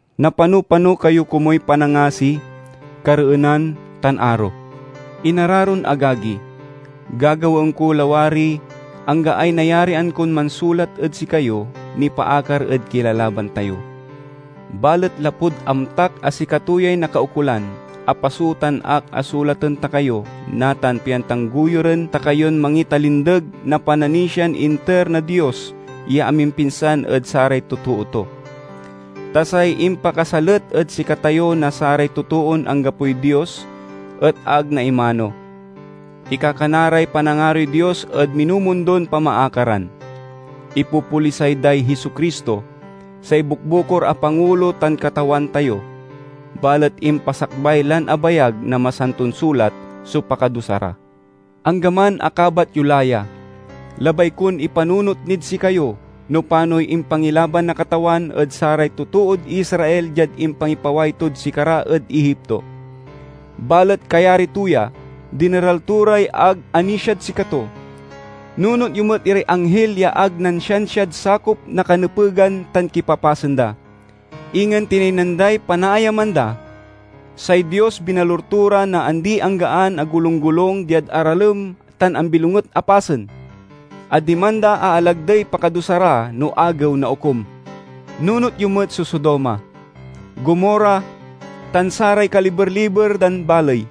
Napano-pano kayo komuy panangasi, kareenan, tan aro. Inararon agagi, gagawaen ko lawariy anggaay nayarian kon mansulat ed sikayo nipaakar ed kilalaban tayo. Balet lapud amtak a sikato yay nakaukolan, apasootan ak a sulaten ta kayo natan pian tanggoyuren ta kayon mangitalindeg na pananisian inter na Dios ya amimpinsan ed saray totoo to. Ta say impakasalet ed sikatayo na saray totoon anggapoy Dios et ag naimano. Ikakana ray panangaroy Dios ed minumundon pamaakaran; ipopolisay day Jesu-Cristo, say bukbukor a Pangulo tan Katawan tayo. Balet impasakbay lan abayag na Masanton Sulat so pakadusa ra. Anggaman a kabat yo la ya, labay kon ipanunot nid sikayo no panoy impangilaban na Katawan ed saray totood Israel diad impangipaway tod sikara ed Egipto, balet kayari to ya, dineral to ray ag anisiad sikato. Nunot yo met iray anghil ya ag nansiansiad sakop na kanepegan tan kipapasen da; ingen tinaynan day panaayaman da. Say Dios binalur to ra na andi-anggaan a golunggolung diad aralem tan ambilonget a pasen, a diman da aalagdey pakadusa ra no Agew na Okum. Nunot yo met so Sodoma, Gomorra, tan saray kaliber-liber dan baley.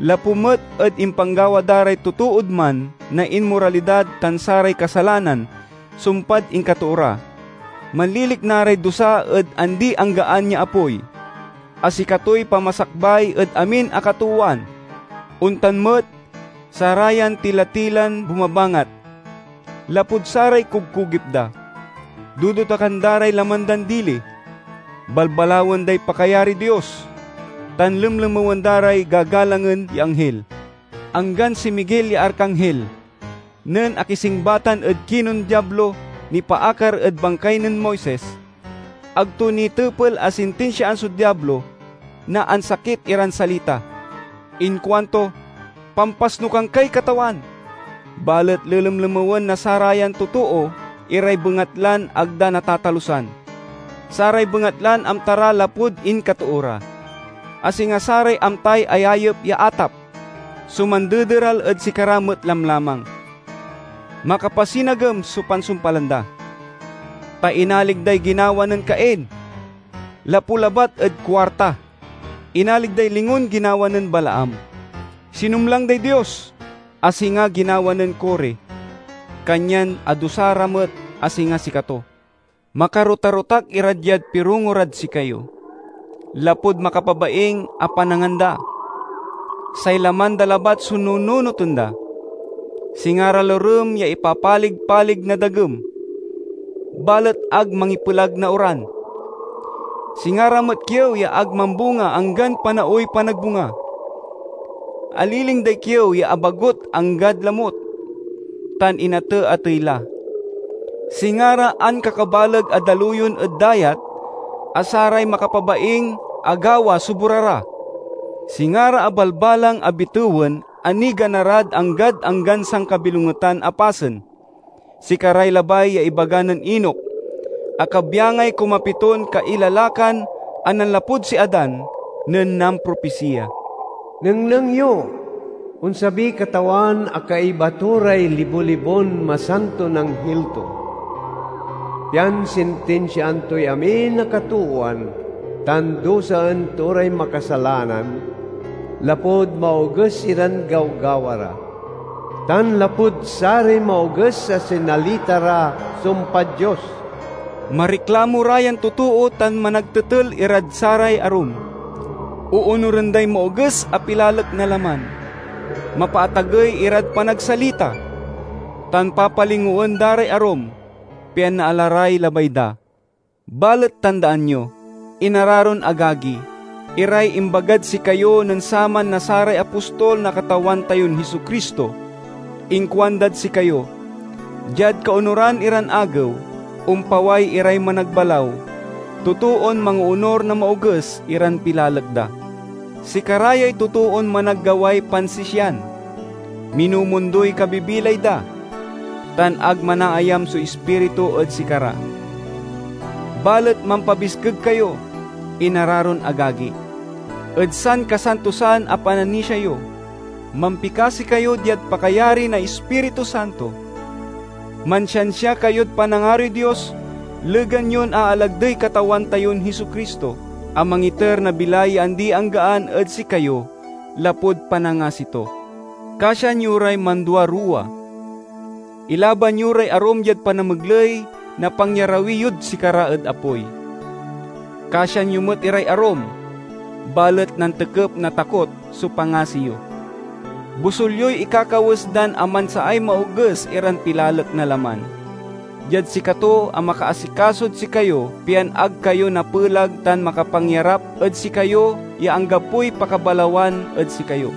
Lapu met ed impanggawa da ray totood man na inmoralidad tan saray kasalanan sumpad inkatoo ra, manlilikna ray dusa ed andi-anggaan ya apoy, a sikatoy pamasakbay ed amin a katoowan. Ontan met, sarayan tila-tilan bumabangat, lapud saray kugkogip da, dodotakan da ray laman dan dili, balbalawen day pakayariy Dios, tan lemlemewen da ray gagalangen ya anghil. Anggan si Miguel ya Arkanghil, nen akisingbatan ed kinen Diablo nipaakar ed bangkay nen Moises, ag to nitepel a sintinsiaan so Diablo na ansakit iran salita. Inkuanto, "Pampasnukan kay Katawan!" Balet lelemlemewen na sarayan totoo iray bengatlan ag da natatalusan. Saray bengatlan amta ra lapud inkatoo ra, a singa saray amtay ayayep ya atap, so mandederal ed sikara met lamlamang. Makapasinagem so pansumpalan da, ta inalig day ginawa nen Cain! Lapu labat ed kuarta, inalig day lingon ginawa nen Balaam. Sinumlang day Dios, a singa ginawa nen Core, kanyan adusa ra met a singa sikato. Makarotarotak ira diad pirongo rad sikayo, lapud makapabaing a panangan da. Say laman da labat so nununoten da. Singa ra lorem ya ipapalig-palig na dagem, balet ag mangipelag na oran. Singa ra met kiew ya ag mambunga anggan panaoy panagbunga; aliling day kiew ya abagut anggad lamut, tan inate-atey la. Singa ra ankakabaleg a daluyon ed dayat a saray makapabaing a gawa so bora ra. Singa ra abalbalang a bitewen a nigana rad anggad anggan sankabilongetan a pasen. Sikaray labay ya ibaga nen Enoc, a kabyangay kumapiton kailalakan a nanlapud si Adan, nen nampropisiya, "Nengneng yo! Onsabiy Katawan a kaiba to ray libo-libon masanton anghil to, pian sintinsiaan toy amin a katoowan tan dusaen to ray makasalanan lapud maoges iran gawgawa ra, tan lapud saray maoges a sinalita ra sumpad Dios!" Mariklamo ra yan totoo tan managtetel irad saray arum; oonuren day maoges a pilalek na laman, mapaatagey irad panagsalita, tan papalingoen da ray arum, pian naala ray labay da. Balet tandaan yo, inararon agagi, iray imbagad sikayo nen saman na saray apostol na Katawan tayon Jesu-Cristo! Inkuandad sikayo, "Diad kaonuran iran agew, ompaway iray managbalaw, totoon mangoonur na maoges iran pilalek da." Sikara yay totoon managgaway pansisian, minumundoy kabibilay da, tan ag manaayam so Ispiritu ed sikara. Balet mampabiskeg kayo, inararon agagi, ed sankasantosan a pananisia yo. Mampikasi kayo diad pakayari na Ispiritu Santo. Mansiansia kayod panangaroy Dios legan yon aalagdey Katawan tayon Jesu-Cristo, a mangiter na bilay ya andi-anggaan ed sikayo lapud panangasi to. Kasian yo ray manduaruwa; ilaban yo ray arum diad panamegley na pangyarawi yod sikara ed apoy. Kasian yo met iray arum, balet nantekep na takot so pangasi yo; bosul yoy ikakawes dan amansaay maoges iran pilalek na laman. Diad sikato a makaasikasod sikayo pian ag kayo napelag tan makapangyarap ed sikayo ya anggapoy pakabalawan ed sikayo,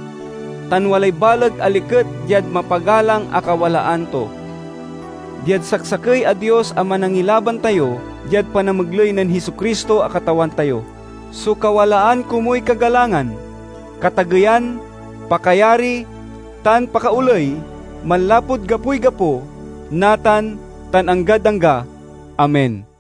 tan walay baleg a liket diad mapagalang a kawalaan to— diad saksakey a Dios a Manangilaban tayo diad panamegley nen Jesu-Cristo a Katawan tayo, so kawalaan komuy kagalangan, katageyan, pakayari, tan pakaoley, manlapud gapoy gapo, natan, tan anggad angga! Amen.